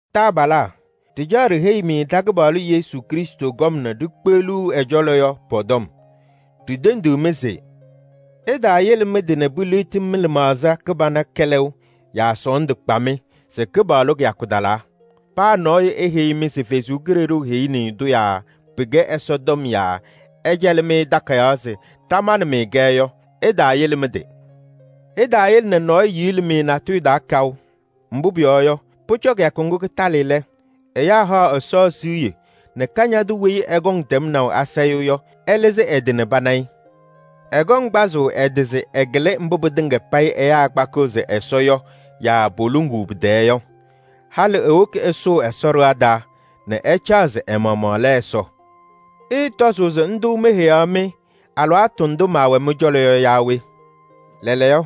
Taabalaa! Ɖɩcaɣ ɖiheyi-mɩ ɖa-Kɩpaɣlʋ Yesu Krɩstʋ kɔm nɛ ɖikpeɣluu ɛ-cɔlɔ yɔ pɔ-tɔm. Ɖitendiɣ-mɩ se: ɩtaayele mɩ-tɩ nɛ piliɣti mɩ-lɩmaɣza kɩbana kɛlɛʋ yaa sɔɔndʋ kpa-mɩ se Kɩpaɣlʋ kɩyakʋ talaa. Paa nɔɔyʋ eheyi-mɩ se Ɛsɔ Kalɩzaɣ heyini-i-tʋ yaa pɩkɛ Ɛsɔ tɔm yaa ɛcɛlɩ-mɩ takayaɣ se ɖamanɩ-mɩ-kɛ yɔ, ɩtaayele mɩ-tɩ. Ɩtaayele nɛ nɔɔyʋ yili-mɩ natʋyʋ taa kaʋ. Mbʋ pʋyɔɔ yɔ, pʋcɔ kɩyakʋ ŋgʋ kɩtalɩ lɛ, ɛyaa haɣ Ɛsɔ siɣye nɛ Kañadʋ weyi ɛkɔŋ tɛmnaʋ asayʋʋ yɔ, ɛlɩzɩ ɛ-tɩ nɛ pana-ɩ. Ɛkɔŋ kpazʋʋ ɛ-tɩ se ɛkɩlɩ mbʋ pɩtɩŋa payɩ ɛyaa kpakɩɣ se Ɛsɔ yɔ yaa poluŋuu pɩ-tɛɛ yɔ. Halɩ ewoki ɛsʋʋ Ɛsɔ ɖɩɣa taa nɛ ɛcaɣ se ɛ-maɣmaɣ lɛ Ɛsɔ. Ɩɩtɔzʋʋ se ndʋ meheyaɣ-mɩ alɩwaatʋ ndʋ maawɛ mɩ-cɔlɔ yɔ yaa we? Lɛɛlɛɛyɔ,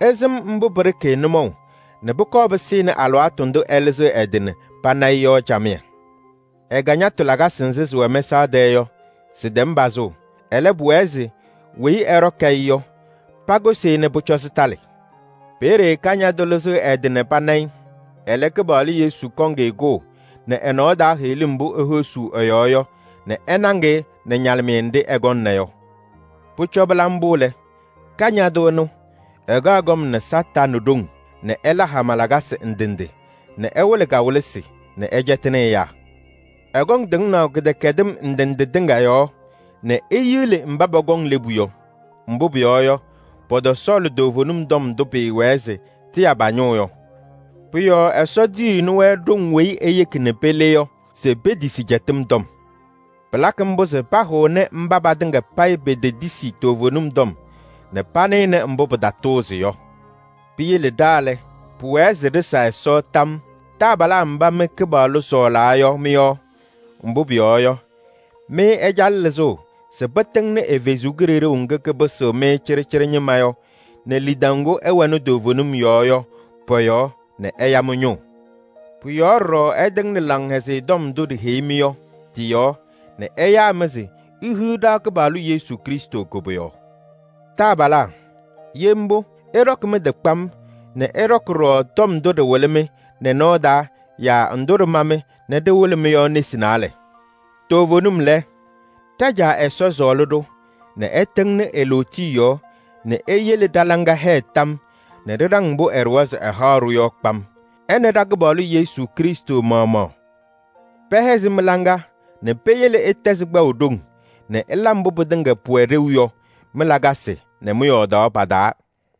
ɩsɩm mbʋ pɩɖɩkɩ-ɩ nʋmɔʋ nɛ pʋkɔɔ pɩsɩnɩ alɩwaatʋ ndʋ ɛlɩzɩɣ ɛ-tɩ nɛ pana-ɩ yɔ camɩyɛ. Ɛ-kañatʋ lakasɩ nzɩ sɩwɛ mɛsaɣ tɛɛ yɔ, sɩtɛm pazʋʋ. Ɛlɛ, pʋwɛɛ se weyi ɛɖɔkɩ-ɩ yɔ, pakʋsɩ-ɩ nɛ pʋcɔ sɩtalɩ. Peeye Kañadʋ lɩzɩɣ ɛ-tɩ nɛ pana-ɩ, ɛlɛ, Kɩpaɣlʋ Yesu kɔŋ-ɩ kʋʋ nɛ ɛ-nɔɔ taa heɣlim mbʋ ehosuu ɛ-yɔɔ yɔ nɛ ɛnaŋ-ɩ nɛ ñalɩmɩyɛ nɖɩ ɛkɔŋna yɔ. Pʋcɔ pɩla mbʋ lɛ, Kañadʋ ɛnʋ, ɛkaɣ kɔm nɛ Satanɩ ɖoŋ nɛ ɛla hama lakasɩ ndɩ ndɩ nɛ ɛwɩlɩ kawɩlɩsɩ nɛ ɛcɛtɩnɩ ɛyaa. Ɛkɔŋ tɩŋnaʋ kɩdɛkɛdɩm ndɩ ndɩ tɩŋa yɔɔ nɛ eyili mba pɔkɔŋ lebu yɔ. Mbʋ pʋyɔɔ yɔ, pɔtɔsɔɔlɩ toovenim tɔm ndʋ pɩɩwɛɛ se tɩya pa-ñʋʋ yɔ. Pʋ-yɔɔ Ɛsɔ tiyiɣni-wɛ ɖoŋ weyi eyeki nɛ pele yɔ se petisi cɛtɩm tɔm. Pɩlakɩ mbʋ se pahʋnɩ mba patɩŋa payɩ petetisi toovenim tɔm nɛ panɩnɩ mbʋ pɩtatʋʋzɩ yɔ. Piyele ɖa lɛ, pʋwɛɛ se ɖɩsa Ɛsɔ tam yɔɔ taabalaa mba mɩ Kɩpaɣlʋ sɔɔlaa yɔ mɩ-yɔɔ. Mbʋ pʋyɔɔ yɔ, mɩ ɛcalɩ lɩzʋʋ se pɩtɩŋnɩ ɛ-Kalɩzaɣ ŋga kapɩsɩɣ-mɩ cɩɖɩcɩɖɩ ñɩma yɔ nɛ lidaʋ ŋgʋ ɩwɛnɩ toovenim yɔɔ yɔ pɔ-yɔɔ nɛ ɛya mɩ-ñʋʋ. Pʋ-yɔɔ ɖɔɖɔ ɛtɩŋnɩ Laŋhɛzɩyɛ Tɔm ndʋ ɖiheyi-mɩ yɔ, tɩ-yɔɔ nɛ ɛyaa-mɩ se ihiɣ ɖa-Kɩpaɣlʋ Yesu Krɩstʋ koboyaɣ. Taabalaa! Ye mbʋ, ɩɖɔkɩ mɩ-tɩ kpam nɛ ɩɖɔkɩ ɖɔɖɔ tɔm ndʋ ɖɩwɩlɩ-mɩ nɛ nɔɔ taa yaa ndʋ ɖɩma-mɩ nɛ ɖɩwɩlɩ-mɩ yɔ nesi naalɛ. Toovenim lɛ, ɖa-Caa Ɛsɔ sɔɔlɩ-ɖʋ nɛ ɛtɩŋnɩ e-lootiye yɔɔ nɛ eyele ɖa-laŋa hɛɛ tam yɔɔ nɛ ɖɩɖaŋ mbʋ ɛɖʋwa se ɛhaɣ-ɖʋ yɔ kpam. Ɛ nɛ ɖa-Kɩpaɣlʋ Yesu Krɩstʋ maɣmaɣ pɛhɛzɩ mɩ-laŋa nɛ peyele ɩtɛzɩ kpaʋ ɖoŋ nɛ ɩla mbʋ pɩtɩŋa pʋwɛ ɖeu yɔ mɩ-lakasɩ nɛ mɩ-yɔɔdaɣ pa-taa.